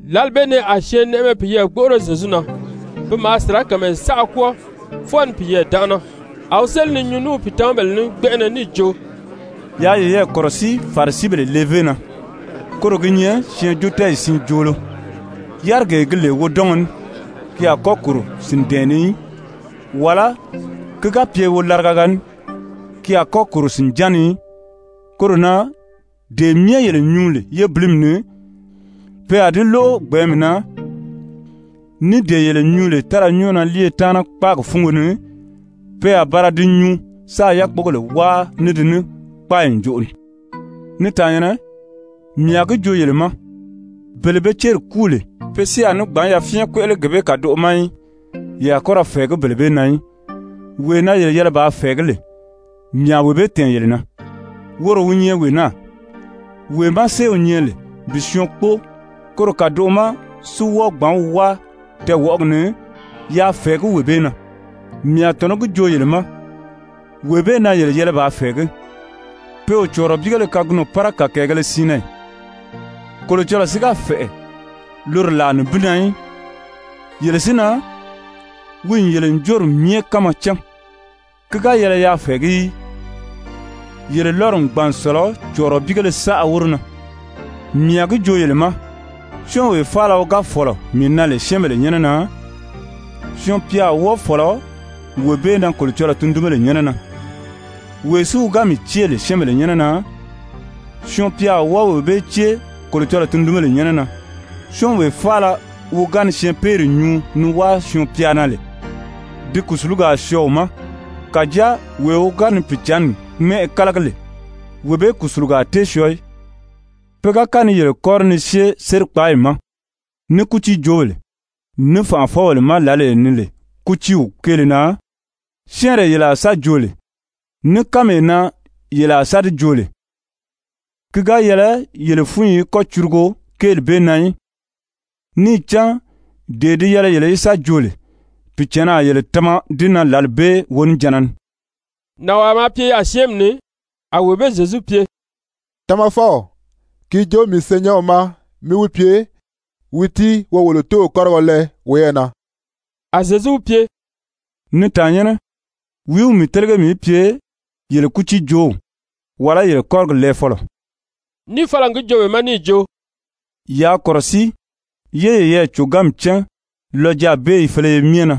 Lǎli bee ni a syɛɛnnɛʔɛmɛ piyɛɛ gbóʔoro Zyezu na, pi maa sirakamayɛ saʔa kwɔ́ɔ fwɔɔ ni piyɛɛ dánʔana, a wi séli ni nyuu ní wi pìitamabèle ní gbɛnʔɛnɛ níì jo: «Yaa yeyɛɛ kɔ̀rɔsíi Farisibèle levé na, koro gi nyɛ syɛɛnjóotɛɛyi siin joolo. Yárigee gi lè wodɔngɔ ní, ki a kɔ́ kòro sìndɛ̀ɛn ni í, wàlá ki ga pye wolaraga ní, ki a kɔ́ kòro sìnján ni í. Koro na dee myɛ yele nyuu lè yébilimi ni, pe a di lóʔo gbɛ̀ɛ́nmi na, ní dee yele nyuu lè tára nyɔ́ɔ na líiye taana kpáagi fúngo ni, pe a ba ra di nyuu sáā yákpogèle wáa ní di ní kpáayi ǹjoʔo ni. «Ni tàannyɛ̀nnɛ, mii a gi joo yele ma, bele be céri kúu lè, pe si a ní gbǎn yafyɛn kpéʔele gee bee kàdoʔo ma í, ye a kɔ́ ra fɛ̀ɛgí bele bee na í. Wee na yele yɛlɛ bàā fɛ̀ɛgí lè, mii a wee bee tɛ̀ɛn yele na. Woro wi nyɛ wee naa: Wee má séew nyɛ lè bi syɔɔn kpóo, koro kàdoʔo ma si wɔ́ɔ gbǎn wi wáa tɛɛwɔʔɔgi ni, yaa fɛ̀ɛgí wee bee na, mii a tɔ̀nɔ́ gi joo yele ma, wee bee na yele yɛlɛ bàā fɛ̀ɛgí. Pe o cɔ̀ɔrɔbiigéle kagunɔ pára kàkɛɛgēle siin na ì? Kolocɔlɔɔ si ga fɛ̀ʔɛ loro làa nibin na í. Yele si na, wi n yele ǹjoori myɛ kánma cán. Ki ga yɛlɛ yaa fɛ̀ɛgí í. Yele lɔ́ri n gbàn n sɔ̀lɔ cɔ̀ɔrɔbiigéle saʔa wóro na. «Mii a gi joo yele ma, syɔ́ɔnwee faala wi ga fɔ̀lɔ mii na lè syɛ́ɛnbèle nyɛ́nɛ na, Syɔɔn-pya a wɔ́ɔ fɔ̀lɔ wee bee na Kolocɔlɔɔ tundunbèle nyɛ́nɛ na. Wee si wi ga mii cée lè syɛ́ɛnbèle nyɛ́nɛ na, Syɔɔn-pya a wɔ́ɔ wee bee cée Kolocɔlɔɔ tundunbèle nyɛ́nɛ na. Syɔ́ɔnwee faala wi ga ni syɛɛnpeeri nyuu ni wáa Syɔɔn-pya na lè, di kùsulugi a syɔɔ wi ma, kàjáa wee wi ga ni Pìicǎnni mɛ́ʔɛ kálagi lè, wee bee kùsulugo a tée syɔɔ í. Pe ga kɔ́ ni yele kɔ́ri ni syée sérikpaayi ma, ní kútiijoobèle, ní fànʔafɔbèle ma lǎlee ni lè kútiiw kéele na, syɛ́ɛnree yele a sa joo lè, ní kánmee na yele a sa di joo lè, ki ga yɛlɛ yele fúnyi í kɔ́ curugo kéeli bee na í. Níì cán dee di yɛlɛ yele í sa joo lè, Pìicǎnni a yele tama di na lǎli bee wonijanna ni.» Nànwaa maa pye yaà syɛ́ɛnmi ni, a wee bee Zyezu pye: «Tamafɔw, ki joo mii senyɛnw ma mí wi pye wi tíi wo wolo tóow kɔ́rigɔ lɛɛ woyɛɛ na.» A Zyezu wi pye: «Ni tàannyɛnnɛ, wìí wi mii télege mii í pye yele kútiijoow, wàlá yele kɔ́rigi lɛɛfɔlɔ?» Níì fala n gi joo be ma níì jo: «Yaa kɔ̀rɔsíi, yé yeyɛɛ còganmi cán lɔjaabeeyi féleye myɛ na.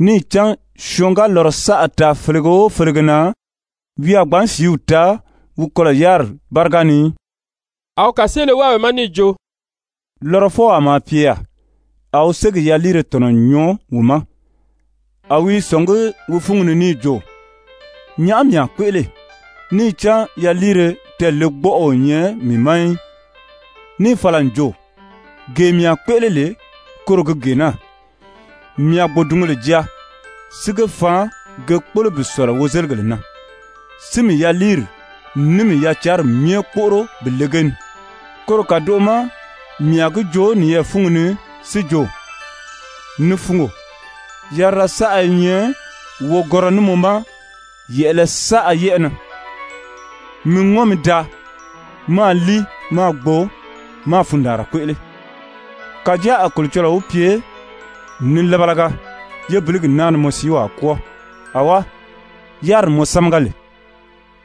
Níì cán syɔɔn ga lɔrɔ saʔa taa felege o felege na, wi a gbǎn sìíw taa wi kɔlɔ̀ yáriri báriga ni í.» A wi kàseele wáa be ma níì jo: «Lɔrɔfɔwaa maa pye yaà, a wi ségi yaliire tɔ̀nɔ n nyɔɔ wi ma, a wi i sɔ̀ngí wi fúngi ni níì jo: ‹Nyàʔá mii a kpéʔele? Níì cán yaliire tɛɛlegbɔʔɔ o nyɛ mii ma í.› Níì fala n jo: ‹Gee mii a kpéʔele lè koro gi gee naa: Mii a gbòdungèle jaa, si ge faan ge kpólo bi sɔ̀lɔ wozeligèle na, si mii yaliiri ní mii yacanri myɛ kpóʔoro bi le ge ni. Koro kàdoʔo ma mii a gi joo niyɛɛ fúngi ni si jo: Ni fungo, yarira saʔa i nyɛ wogɔnrɔ ní mɔ ma yɛ̀ʔɛlɛ saʔa yɛ́ʔɛ na. Mi ŋɔ́n mi daa, máā líi, máā gbo, máā fundaanra kpéʔele.› Kàjáa a Kolocɔlɔɔ wi pye: ‹Nilabalaga, yébiligi naa ni mɔ siiw a kwɔ́ɔ. Awá, yáriri mɔ sámaga lè,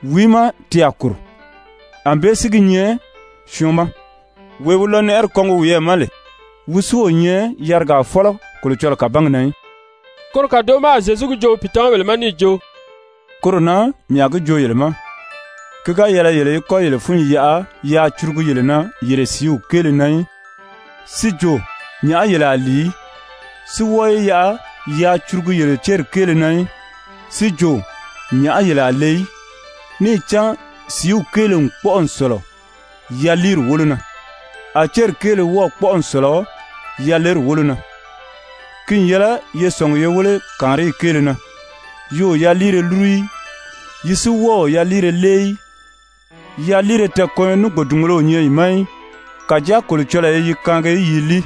wìí má ti a kòro?› Anbée si gi nyɛ syɔɔn ma, wee wi lɔnɛʔɛri kɔngi wiyɛɛ ma lè, wi si o nyɛ yarigaa fɔ́lɔ Kolocɔlɔɔ kàbangi na í.» Koro kàdoʔo ma a Zyezu gi joo wi pìitamabèle ma níì jo: «Koro na mii a gi joo yele ma, ki ga yɛlɛ yele í kɔ́ yele fúnyi yaʔa yaa curugu yele na yele sìíw kéele na í, si jo nyàʔá yele a lìi í, si wɔ́ɔ yi yaʔa yaa curugu yele céri kéele na í, si jo nyàʔá yele a le í. Níì cán sìíw kéele n kpɔ́ʔɔ n sɔ̀lɔ yaliiri wólo na, a céri kéele wɔ́ɔ̀ kpɔ́ʔɔ n sɔ̀lɔ yaleri wólo na. Ki n yɛlɛ ye sɔ̀ngi ye wéle kàanriyi kéele na, yi o yaliire lúru í, yi si wɔ́ɔ o yaliire lée í, yaliire tɛɛkɔnyɔ ní gbòdungēle o nyɛ yi ma í. Kàjáa Kolocɔlɔɔ i yi kaangi yi i líi.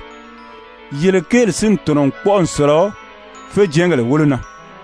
Yele kéeli si n tɔ̀nɔ n kpɔ́ʔɔ n sɔ̀lɔ féjɛɛngèle wólo na!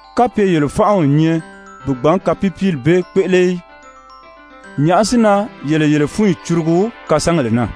Kapye yele fánʔa o nyɛ bi gbǎn kapiipiili bee kpéʔele í, nyàʔá si na yele yele fúnyi curugu kasangèle na?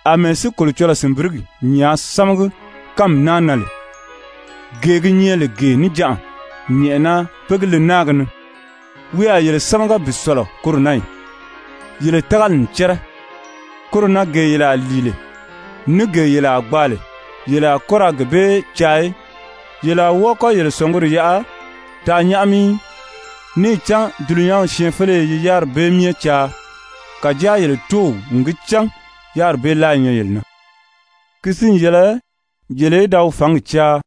Amɛɛ si Kolocɔlɔɔ sìnbirigi nyàā sámagi kánmi naa na lè, gee gi nyɛ lè gee níjanʔa, nyɛ̀ʔɛna pé gi le náagi ni, wi a yele sámaga bi sɔ̀lɔ koro na ì? Yele tágali n cɛ́rɛ. Koro na gee yele a lìi lè, ní gee yele a gbaa lè, yele a kɔ́ ra gee bee caa í, yele a wɔ́ɔ kɔ́ yele sɔ̀nguri yaʔa taa nyáʔami í. Níì cán dulunyanw syɛɛnfeleye yi yáriri bee myɛ caa. Kàjáa yele Tóow n gi cán yáriri bee láa i nyɛ yele na. Ki si n yɛlɛ yele í da wi fǎngi caa,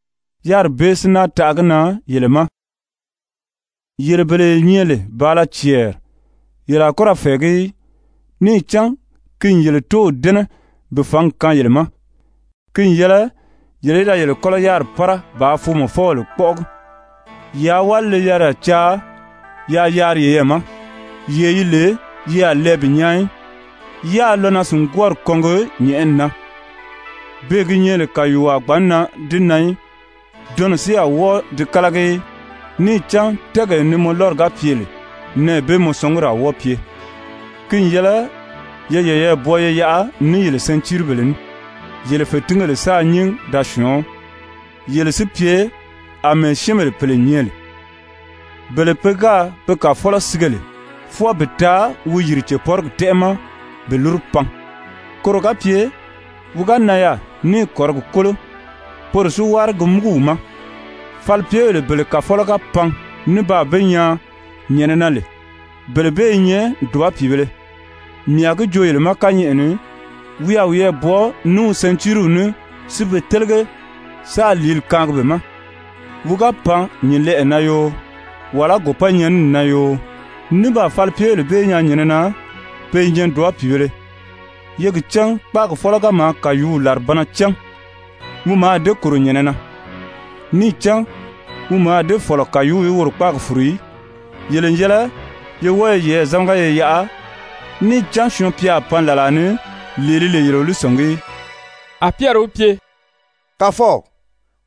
yáriri bee si náa taʔa gi na yele ma. «Yele bele ye nyɛ lè bàala cɛɛri, yele a kɔ́ ra fɛ̀ɛgí í. Níì cán ki n yele Tóow dɛ́nɛ bi fǎngi kaan yele ma. Ki n yɛlɛ yele í da yele kɔ́lɔ yáriri pára bàā foomɔfɔbèle kpɔ́ʔɔgi. Yaa wálile-yariya caa yaa yaari yeyɛɛ ma, yee yi lè yi a lɛɛ bi nyaa í, yáā lɔnaa-sìngwɔɔri kɔngi nyɛ̀ʔɛni na, beè gi nyɛ lè kàyuuo a gbǎn nan di na í, dɔnnɔ si a wɔ́ɔ di kálagi í. Níì cán tɛ́ɛgee ni mɔ lɔ́ri ga pye lè, nɛɛ bee mɔ sɔnguri a wɔ́ɔ pye. «Ki n yɛlɛ ye yeyɛɛ bwɔɔ ye yaʔa ní yele sɛntiiribèle ní, yele fètingèle sáā nyín da syɔ̀ɔ́n. Yele si pye àmɛɛ syɛ́ɛnbèle pèle nyɛ lè, bele pe gáā be kàfɔlɔ sige lè fwɔɔ bi taa wi yìri cèpɔrigi tɛ́ʔɛ ma bi lúru pan, koro ga pye wi ga nan yaà níì kɔ̀rigi kólo, poro si wári gi múgu wi ma. Falipyebèle bele kàfɔlɔ ga pan ní baa be nyaa nyɛ̀nɛ na lè, bele bee i nyɛ dùba pìibēle. Mii a gi joo yele ma kányɛʔɛ ni wi a wiyɛɛ bwɔɔ ní wi sɛntiiriw ní, si be télege, sáā lìíli kaangi be ma. Wi ga pan nyǐnlɛʔɛ na yoo, wàlá gòpɔ́nyɛnini na yoo, ní baa falipyebèle bee nyaa nyɛ̀nɛ na, pe i nyɛ dùba pìibēle. Ye gi cán kpáagi fɔ́lɔ ga maa kàyuuw làribanna cán, wi mǎà dée kòro nyɛ̀nɛ na, níì cán wi mǎà dée fɔ̀lɔ kàyuuw í woro kpáagi fùru í. Yele n yɛlɛ ye wɔ́ɔ ye yeyɛɛ zámaga ye yaʔa, níì cán Syɔɔn-pya a pan làlaa ni, lee ni lè yele o wi sɔ̀ngí í.» A Pyɛri wi pye: «Kàfɔw,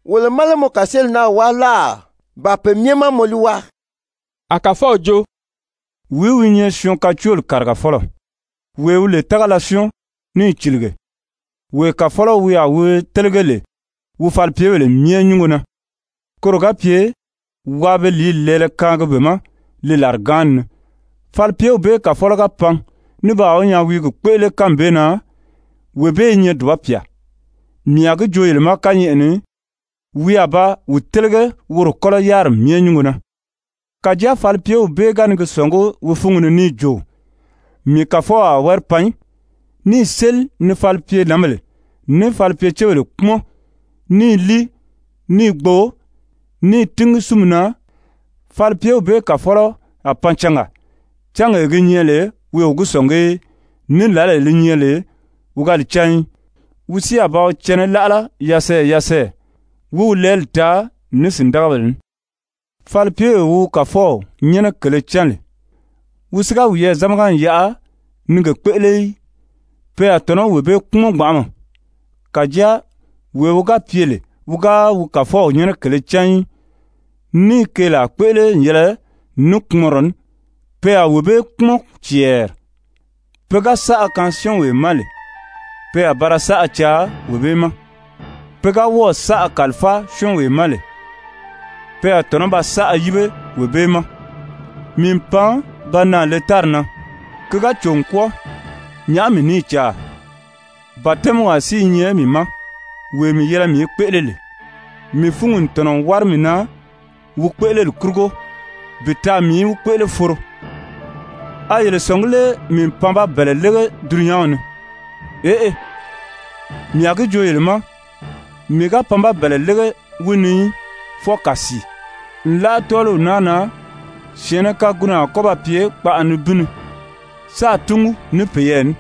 wolo má lé mɔ kàseeli naa wáa láà, ba pe myɛ má mɔ li wáa?» A Kàfɔw jo: «Wìí wi nyɛ syɔɔn kacooli kàrigafɔlɔ, wee wi lè tágala syɔ́ɔn níì cìlige, wee kàfɔlɔ wi a wi télege lè wi falipyebèle myɛ nyúngo na, koro ga pye waa be lìíli lɛɛlɛ kaangi be ma li làrigaanni ni? Falipyew bee kàfɔlɔ ga pan ní baa wi nyaa wi i gi kpéʔele kánmi bee na, wee bee i nyɛ dùba pyà. Mii a gi joo yele ma kányɛʔɛ ni, wi a ba wi télege woro kɔ́lɔ yáriri myɛ nyúngo na. Kàjáa falipyew bee ga ni gi sɔ̀ngí wi fúngi ni níì jo: ‹Mii kàfɔw a wári pan í,› níì séli ni falipyenǎnbèle ní falipyecebèle kpúmɔn ní i líi, ní i gbo, ní i tíngi sínmi na, falipyew bee kàfɔlɔ a pan cangaa, cángee gi nyɛ lè wi o gi sɔ̀ngí í, ní lǎlee li nyɛ lè wi ga li cán í. Wi si a ba wi cɛnɛ láʔala yasɛɛyɛ yasɛɛyɛ wí wi lɛɛli taa ní sìndagabèle ní. Falipyewee wi wi kàfɔw nyɛ́nɛ kèlē cán lè, wi si ga wiyɛɛ zámaga n yaʔa ní i ge kpéʔele í, pe a tɔ̀nɔ́ wee bee kpúmɔn gbanʔama. Kàjáa wee wi ga pye lè wi ga wi kàfɔw nyɛ́nɛ kèlē cán í, níì keelaa kpéʔele n yɛlɛ ní kpumɔnrɔ ní, pe a wee bee kpúmɔn cɛɛri. Pe ga saʔa kaan syɔ́ɔnwee ma lè, pe a ba ra saʔa caa wee bee ma, pe ga wɔ́ɔ̀ saʔa kàlifáa syɔ́ɔnwee ma lè, pe a tɔ̀nɔ́ ba saʔa yíbe wee bee ma. «Mii n pan ba naà le tári na, ki ga cò n kwɔ́ɔ, nyàʔá mii ní i caa? Batɛmiwaa si i nyɛ mii ma, wee mii yɛlɛ mii í kpéʔele lè, mii fúngi n tɔ̀nɔ n wári mii na wi kpéʔeleli kurugo bi taa mii í wi kpéʔele foro! A yele sɔ̀ngí lé mii n pan ba bɛ̀ɛlɛ lége dulunyanw ni? Eʔe, mii a gi joo yele ma mii ga pan ba bɛ̀ɛlɛ lége wi ni í, fwɔɔ kàsii. Nlaʔa tɔ́ɔliw naa na, syɛ̀ɛnnɛ kagunɔ a kɔ́ ba pye kpaʔa nibin ni sáā túngu ní peyɛɛ ní,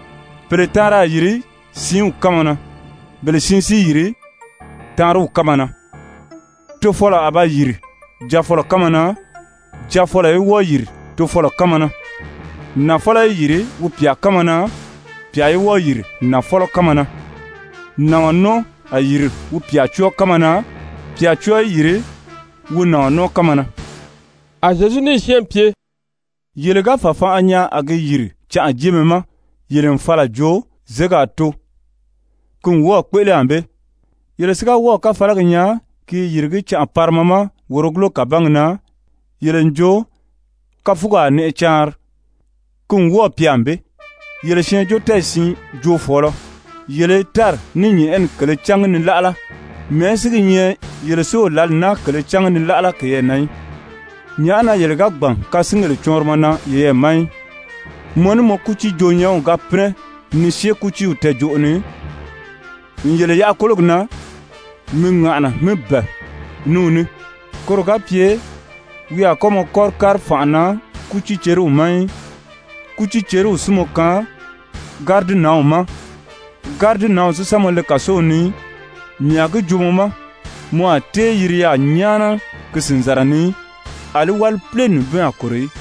pèle taanri a yìri siinw kánma na, bele siin í yìri taanriw kánma na. Tofɔlɔ a ba yìri jaafɔlɔ kánma na, jaafɔlɔ i wɔ́ɔ yìri tofɔlɔ kánma na, nafɔlɔ a yìri wi pyà kánma na, pyà í wɔ́ɔ yìri wi nafɔlɔ kánma na, nàɔn nɔ́ɔ a yìri wi pyà cɔ́ɔ kánma na, pyà cɔ́ɔ í yìri wi nàɔn nɔ́ɔ kánma na.» A Zyezu níì syɛ́ɛnmi pye: «Yele ga fàfanʔa nyaa a gi yìri canʔajeemɛ ma, yele n fala n jo: ‹Zěgi a too.› Ki n wɔ́ɔ̀ kpéʔele ànbée. Yele si ga wɔ́ɔ̀ káfalagi nyaa ki i yìrigí canʔa parima ma wòrogulo kàbangi na, yele n jo: ‹Káfugi a nɛʔɛ caanri.› Ki n wɔ́ɔ̀ pye ànbée. Yele syɛɛnjóotɛɛyi siin joofɔɔlɔ, yele i tári ní nyɛ̀ʔɛni kèlē cángi ni láʔala, mɛ̀ɛ́ si gi nyɛ yele si o lǎli naa kèlē cángi ni láʔala keyɛɛ na í? «Nyàʔá na yele ga gbàn kasingèle cɔɔnrimɔ na yeyɛɛ ma í? Mɔ ní mɔ kútiijoo-nyɛ́nw ga pínɛ ni syée kútiiw tɛɛjoʔo ni, n yele yaʔa kólogi na, mi ŋàʔana mi bɛ̀ɛ ní wi ní, koro ga pye wi a kɔ́ mɔ kɔ́ri kári fànʔa na kútiiceriw ma í, kútiiceriw si mɔ kaan gáridinanw ma, gáridinanw si sa mɔ le kàsow ni í. Mii a gi joo mɔ ma, mɔ a tée yiri yaà nyáana ki sìnzara ni í, àlí wálipile nibin a kòro í.»